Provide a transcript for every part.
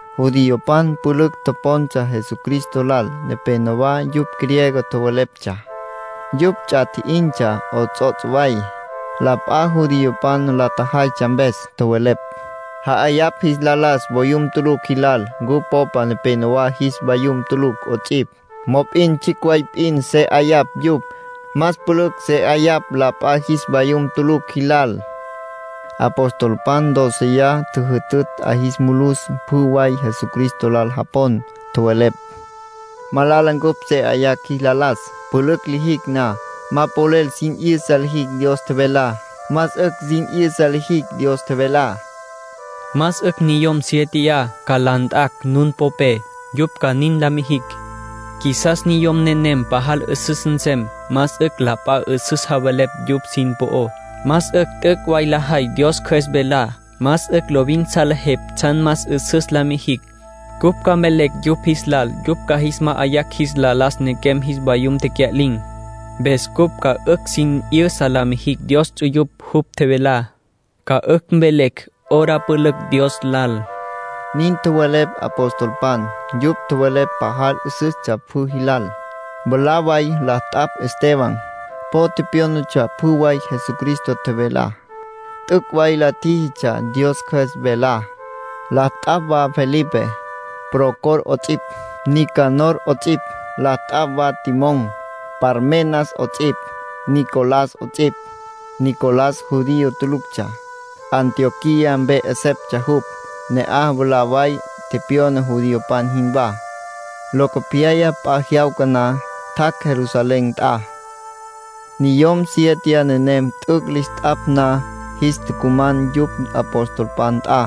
Judiopan pülücj topontsja Jesucristo lal. Nepénowa yupj griego tjoweleptsja. Yupj ts'a tji'intsja 'ots'ots' way, la p'a judiopan la tjajaytsja mpes. Tjowelepj: “Ja'ayapj jis la las voyum tulucj jilal. Cupj popa nepenowá jis vayum tulucj 'ots'ipj, mop'in tsjicj way p'in se 'ayapj yupj. Más pülücj se 'ayapj la p'a jis vayum tulucj jilal”, nin tjowelepj. Apostolpan dóceya tjüjütütj 'a jis mulus pjü way Jesucristo lal japon. Tjowelepj: “Malala cupj se 'ayacj jis la las. Pülücj lijicj na, ma polel sin 'yüsa lijicj Dios tjevelá. Más 'ücj sin 'yüsa lijicj Dios tjevelá. Más 'ücj niyom siéteya ca la nt'a nun popé, yupj ca nin la mijicj. Qjuisas niyom nenem pajal 'üsüs nsem. Más 'ücj la p'a 'üsüs javelepj yupj sin po'ó. Más 'ücj t'üc' way lajay Dios Cjües velá. Más 'ücj lovin salejepj tsjan más 'üsüs la mijicj. Cupj ca mvelecj yupj jis lal yupj ca jis ma'ayacj jis la las nequem jis vayum tecya'lin̈. Mpes cupj ca 'ücj sin 'yüsa la mijicj Dios ts'uyupj jupj tjevelá. Ca 'ücj mvelecj hora pülücj Dios lal”, nin tjowelepj apostolpan. Yupj tjowelepj pajal 'üsüstsja pjü jilal. Mwalá way la t'apj Esteban. Po tepyónatsja pjü way Jesucristo tjevelá. T'üc' way la tjíjitsja Dios Cjües velá. La t'apj wa Felipe, Prócor 'ots'ipj, Nicanor 'ots'ipj. La t'apj wa Timón, Parmenas 'ots'ipj, Nicolás 'ots'ipj. Nicolás judío tuluctsja. Antioquía mpe 'eseptsja jupj. Ne'aj mwalá way tepyona judiopan jinwá. Locopyaya, p'a jyawca na, tjac' Jerusalén nt'a. Niyom siete nenem t'üc' lis t'apj na, jis tucuman yupj apostolpan nt'a.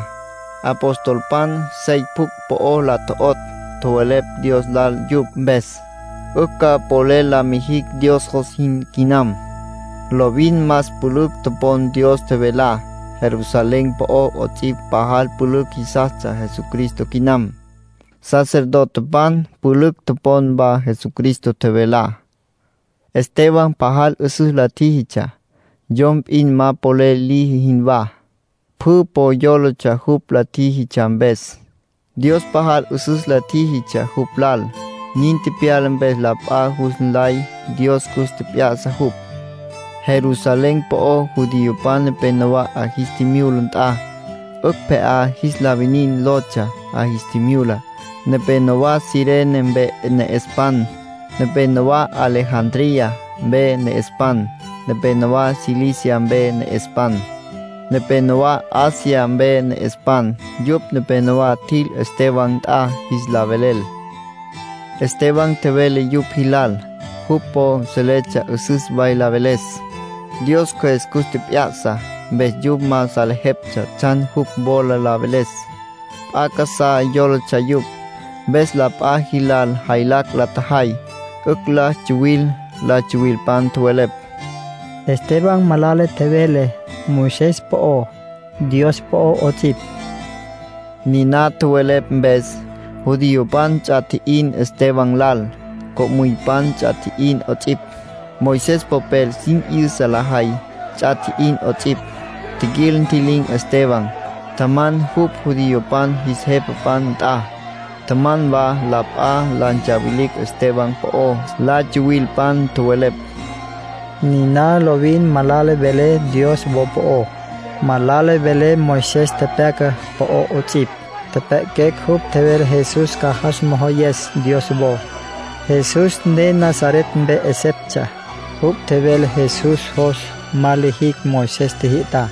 Apostolpan sey pjucj po la tjo'otj, tjowelepj Dios lal yupj mpes. 'Ücj ca polel la mijicj Dios jos jin quinam. Lovin más pülücj topon Dios tjevelá. Jerusalén po'o 'ots'ipj pajal pülücj jisastsja Jesucristo quinam. Sacerdotepan pülücj topon wa Jesucristo tjevelá. Esteban pajal 'üsüs la tjíjitsja, yom p'in ma polel liji jinwá. Pjü po yólatsja jupj la tjíjitsja mpes. Dios pajal 'üsüs la tjíjitsja jupj lal. Nin tepyala mpes la p'a jus nlay Dios cus tjep'ya'sa jupj. Jerusalén po'ó, judiopan nepenowá 'a jis tjimyula nt'a, “'Ücj Pje'á Jis La Winin” lotsja. 'A jis tjimyula, nepénowa Cirene mpe ne'espan. Nepénowa Alejandría mpe ne'espan. Nepénowa Cilicia mpe ne'espan. Nepénowa Asia mpe ne'espan. Yupj nepenowá tjil Esteban nt'a jis la velel. Esteban tjevele yupj jilal. Jupj po seletsja 'üsüs way la veles. Dios Cjües cus tjep'ya'sa. Mpes yupj ma salejeptsja tsjan jupj wola la veles. P'a casá yólatsja yupj. Mpes la p'a jilal jaylacj la tjajay, 'ücj la tsuwil. La tsuwilpan tjowelepj: “Esteban malala tjevele Moisés po'ó, Dios po'ó 'ots'ipj”. Niná tjowelepj mpes, judiopan ts'a tji'in Esteban lal. Co'müypan ts'a tji'in 'ots'ipj, Moisés popel sin 'yüsa lajay ts'a tji'in 'ots'ipj. Tjiquil, ntji'lin̈ Esteban, tjaman jupj judiopan jis jepapan nt'a. Tjaman wa la p'a, la ntsawilicj Esteban po'ó. La tsuwilpan tjowelepj: —Niná lovin malala vele Dios wo po'ó, malala vele Moisés tepyaca po'ó 'ots'ipj. Tjepjya'aquecj jupj tjevele Jesús ca jas mojoyes Dios wo. Jesús ne Nazaret mpe 'eseptsja. Jupj tjevele Jesús jos ma lijicj Moisés tjijyü'tá.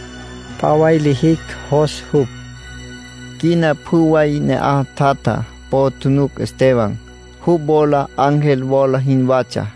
P'a way lijicj jos jupj —nin tjowelepj la tsuwilpan. Quina pjü way ne'aj tjatja po tjunuc Esteban. Jupj wola ángel wola jinwatsja.